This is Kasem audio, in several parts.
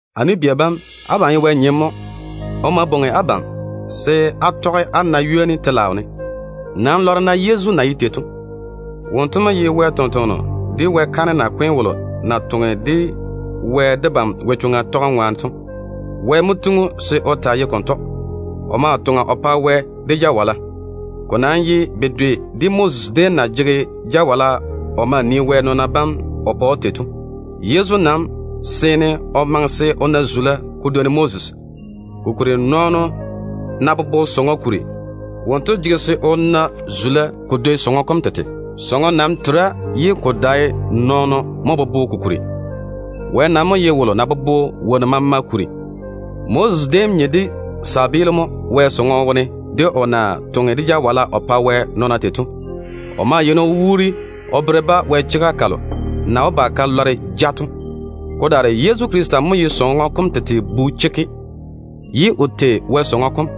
A nu-bia balo na ye Wɛ nyem to, Wɛ bwoŋi abam se á tɔge á na ywoni telaao ne. Nam boŋe-na á nii Yezu na ye tei to. Wonto mo ye Baŋa Wɛ tontoŋ-kweo de Wɛ kaanem nakwe tu wolo dé na jege o chega to. Wɛ mo tiŋi‑o se o taa ye konto, ye o toŋa o pa Wɛ de jawala. Ko nam ye bedwe mo de Moses déem na jege jawala o nii Wɛ nɔɔna bam o pa‑o tei to. Yezu nam seene o maŋe se o na zula ko dwoni Moses, kokuri nɔɔno ná bobo sɔŋɔ kuri, wonto jege se o na zula se ko dwoi sɔŋɔ kom tete. Sɔŋɔ nam tera ye ko dae nɔɔno mo bobo ko kuri. Wɛ nam mo ye wolo na bobo wonnu maama kuri. Moses déem nye de tontoŋeno mo Wɛ sɔŋɔ wone, de o na toŋe de jawala o pa Wɛ nɔɔna tei to. O ma yeini o wuuri o bere-ba Wɛ chega kalo na wó ba ka lɔre ja to. Ko daare Yezu Krista mo ye sɔŋɔ kom tete bu chekke, ye o tei Wɛ sɔŋɔ kom.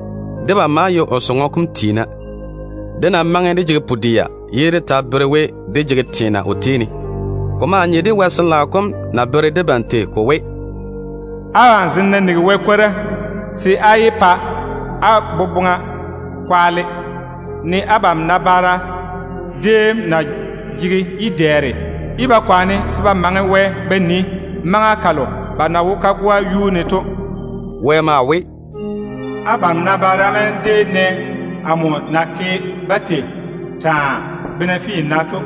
Debam maa ye o sɔŋɔ kom tiina, ne dé ná maŋe dé jege pu-dɛa ye dé ta bere we, dé jege teena o tei ne to. Ko maa nye de Wɛ Sin-laao kom na bere debam tei ko we: “Abam zem ná nigi Wɛ kwora, se á yé pa á wo ke dam, ne á nabaara déem na jege yi-dɛɛre ye ba kwaane se ba maŋe Wɛ ba nii maŋa kalo ba na wo kagoa kam yuu ne to.” Wɛ maa we: “Abam nabaara bam déem nɛ amo na ke-ba tei taa, bena finna to,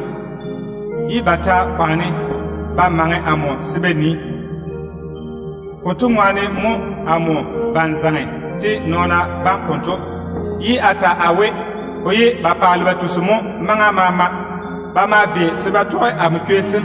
ye ba ta kwaane se ba maŋe amo ba nii. Konto ŋwaane mo amo bane zaŋe de á nabaara bam konto, ye a ta a we, ‘Ba yeini ba paale ba tusi mo maŋa maama. Ba maa ba sɛa se ba tɔge amo chwei sem.’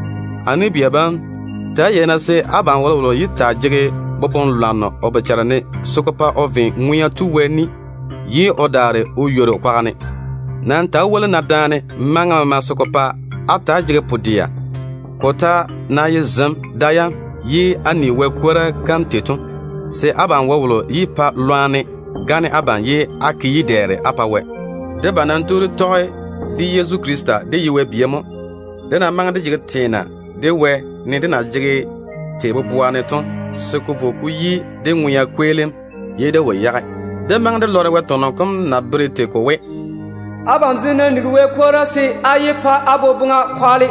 A nu-bia bam, ta‑á yei-na se abam wolowolo yé taa jege boboŋ-lwanno o bochare ne se ko pa o ve Ŋwea Tu Wɛ ni ye o daare o ywori o kwaga ne. Nam ta‑á woli-na daane maŋa maama, se ko pa á ta‑á jege pu-dɛa. Ko ta ná ye zem da yam ye á ni Wɛ kwora kam, se abam wolowolo yé pa lwarem gane‑o pa se o ke yi-dɛɛre o pa Wɛ. Debam nam tu dé tɔge de Yezu Krista dé ye Wɛ bia mo, ne dé ta ná jege teena de Wɛ, nenɛɛne dé na maŋe dé jege tei boboa ne to, se ko vo ko yi dé ŋwea kweelim. Dé maŋe dé lɔre Wɛ tɔnɔ kom na bere tei ko we: “Abam zem ná nigi Wɛ kwora, se á yé pa á wo ke dam,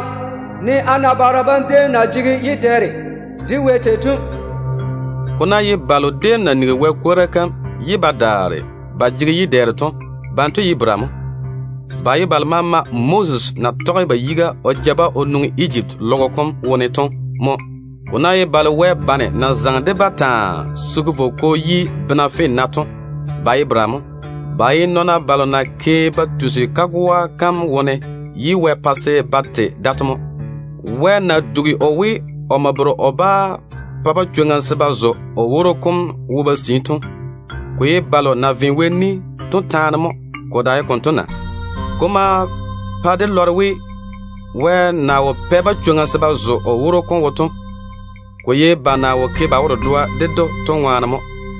ne á nabaara bam déem na jege yi-dɛɛre de Wɛ tei to.” Ko ná ye balo déem na nigi Wɛ kwora kam ye ba daare ba jege yi-dɛɛre to, banto ye bera mo? Ba ye balo maama Moses na tɔge ba yiga o ja o nwoŋi Ejipti teo kom wone to mo. Ko ná ye balo Wɛ bane na zaŋe de-ba taa se ko vo ko yi bena finna to, ba ye bera mo? Ba ye nɔɔna balo na ke ba tusi kagoa kam wone ye Wɛ pa se ba te da to mo. Wɛ na dugi o we, omo bere o bá pa-ba chwoŋa se ba zo o woro kom wo ba sii to, ko ye balo na ve o ni to taane mo. Ko dae konto na? Ko ma pa dé lɔre we, Wɛ na wo pɛ-ba chwoŋa se ba zo o woro kom wo to, ko ye ba na wo ke ba wo-dedoa ded‑o to ŋwaane mo.